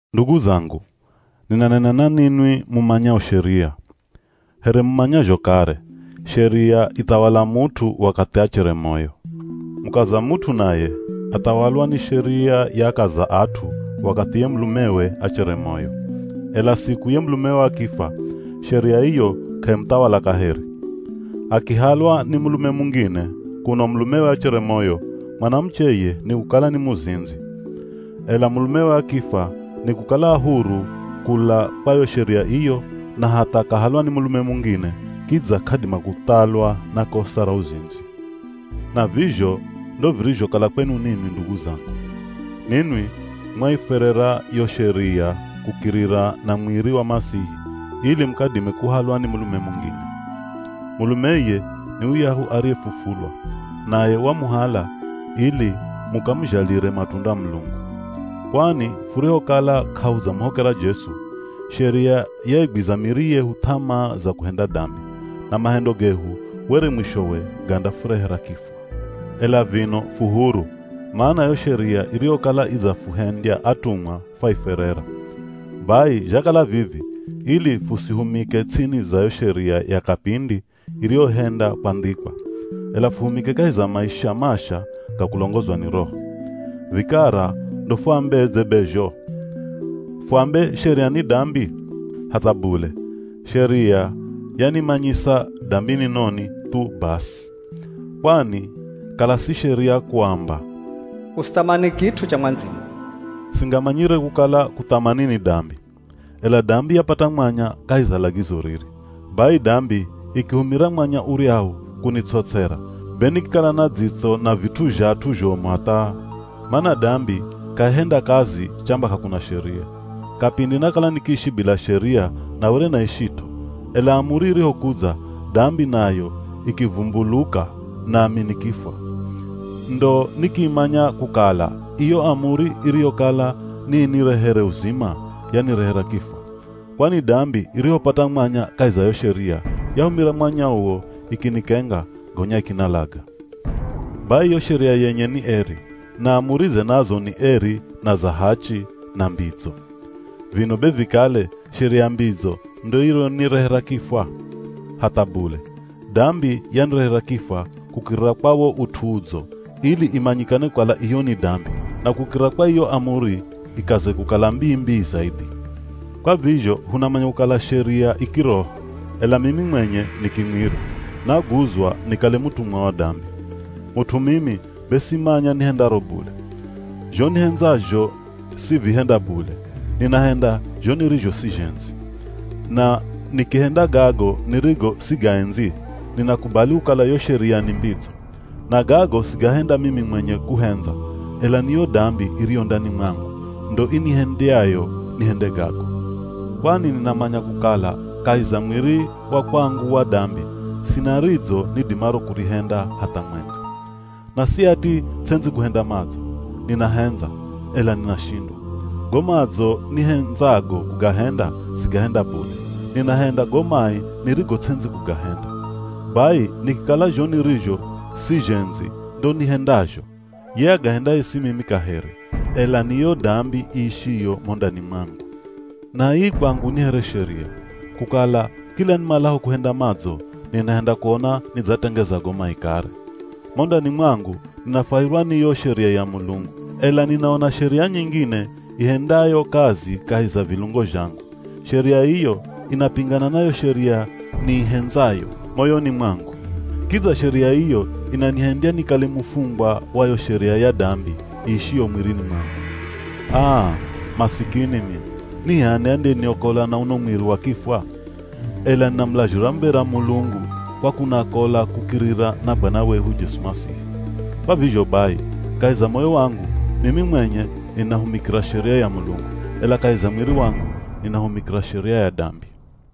Ndugu zangu, ninanena na ninwi mumanyao Sheria. Here mumanyazho kare, Sheria ithawala mut'u wakathi achere moyo. Mukaza mut'u naye, athawalwa ni Sheria ya akaza at'u wakathi ye mulumewe achere moyo. Ela siku ye mulumewe akifwa, Sheria iyo k'aimuthawala kaheri. Akihalwa ni mulume mungine kuno mulumewe achere moyo, mwanamuche iye nikukala ni muzindzi. Ela mulumewe akifwa, nikukala a huru kula kwa yo Sheria iyo, na hatha akahalwa ni mulume mungine kidza k'adima kuthalwa na kosa ra uzindzi. Na vizho ndo virizhokala kwenu ninwi ndugu zangu. Ninwi mwaifwerera yo Sheria kukirira na mwiri wa Masihi ili mukadime kuhalwa ni mulume mungine. Mulume iye ni yuyahu ariyefufulwa, naye wamuhala ili mukamuzhalire matunda Mulungu. Kwani furihokala k'ahudzamuhokera Jesu, Sheria yaigwiza miri yehu th'amaa za kuhenda dambi. Na mahendo gehu were mwishowe gandafurehera kifwa. Ela vino fu huru, mana yo Sheria iriyokala idzafuhendya atumwa fwaifwerera. Bai zhakala vivi ili fusihumike ts'ini za yo Sheria ya kapindi iriyohenda kwandhikwa, ela fuhumike kahi za maisha masha ga kulongozwa ni Roho. Vikara ndo fuambedze be zho? Fuambe Sheria ni dambi? Hatha bule! Sheria yanimanyisa dambi ni noni, thu basi. Kwani kala si Sheria kuamba, “Usithamani kit'u cha mwandziyo,” singamanyire kukala kuthamani ni dambi. Ela dambi yapata mwanya kahi za lagizo riri. Bai dambi ikihumira mwanya uryahu kunitsotsera, be nikikala na dzitso na vit'u zha at'u zhomu hatha! Mana dambi k'aihenda kazi chamba k'akuna Sheria. Kapindi nakala nikiishi bila Sheria na were naishit'o, ela amuri irihokudza dambi nayo ikivumbuluka, nami nikifwa. Ndo nikimanya kukala iyo amuri iriyokala niinirehere uzima, yanirehera kifwa. Kwani dambi irihopata mwanya kahi za yo Sheria, yahumira mwanya uwo ikinikenga, gonya ikinalaga. Bai yo Sheria yenye ni eri, na amurize nazo ni eri, na za hachi, na mbidzo. Vino be vikale Sheria mbidzo ndo iriyonirehera kifwa? Hatha bule! Dambi yanirehera kifwa kukirira kwa wo ut'u udzo ili imanyikane kukala iyo ni dambi, na kukirira kwa iyo amuri ikaze kukala mbii-mbii zaidhi. Kwa vizho hunamanya kukala Sheria i kiroho, ela mimi mwenye ni kimwiri, naguzwa nikale mutumwa wa dambi. Mut'u mimi be simanya nihendaro bule. Zho nihendzazho sivihenda bule, ninahenda zho nirizho sizhendzi. Na nikihenda gago nirigo sigaendzi, ninakubali kukala yo Sheria ni mbidzo. Na gago sigahenda mimi mwenye kuhendza, ela ni yo dambi iriyo ndani mwangu, ndo inihendyayo nihende gago. Kwani ninamanya kukala kahi za mwiri wa kwangu wa dambi, sina ridzo nidimaro kurihenda hatha mwenga. Na si ati ts'endzi kuhenda madzo, ninahendza, ela ninashindwa. Go madzo nihendzago kugahenda sigahenda bule, ninahenda go mai nirigo ts'endzi kugahenda. Bai, nikikala zho nirizho sizhendzi ndo nihendazho, ye agahendaye si mimi kaheri, ela ni yo dambi iishiyo mo ndani mwangu. Na ii kwangu ni here sheria, kukala kila nimalaho kuhenda madzo, ninahenda kuona nidzatengeza go mai kare. Mo ndani mwangu ninafwahirwa ni yo Sheria ya Mulungu. Ela ninaona sheria nyingine ihendayo kazi kahi za vilungo zhangu. Sheria iyo inapingana na yo Sheria niihendzayo, moyoni mwangu. Kidza sheria iyo inanihendya nikale mufungwa wa yo sheria ya dambi iishiyo mwirini mwangu. Aa! Masikini mino. Ni h'ani andiyeniokola na uno mwiri wa kifwa? Ela ninamulazhira muv̱era Mulungu kwa kunakola kukirira na Bwana wehu Jesu Masihi! Kwa vizho bai, kahi za moyo wangu mimi mwenye ninahumikira Sheria ya Mulungu, ela kahi za mwiri wangu ninahumikira sheria ya dambi.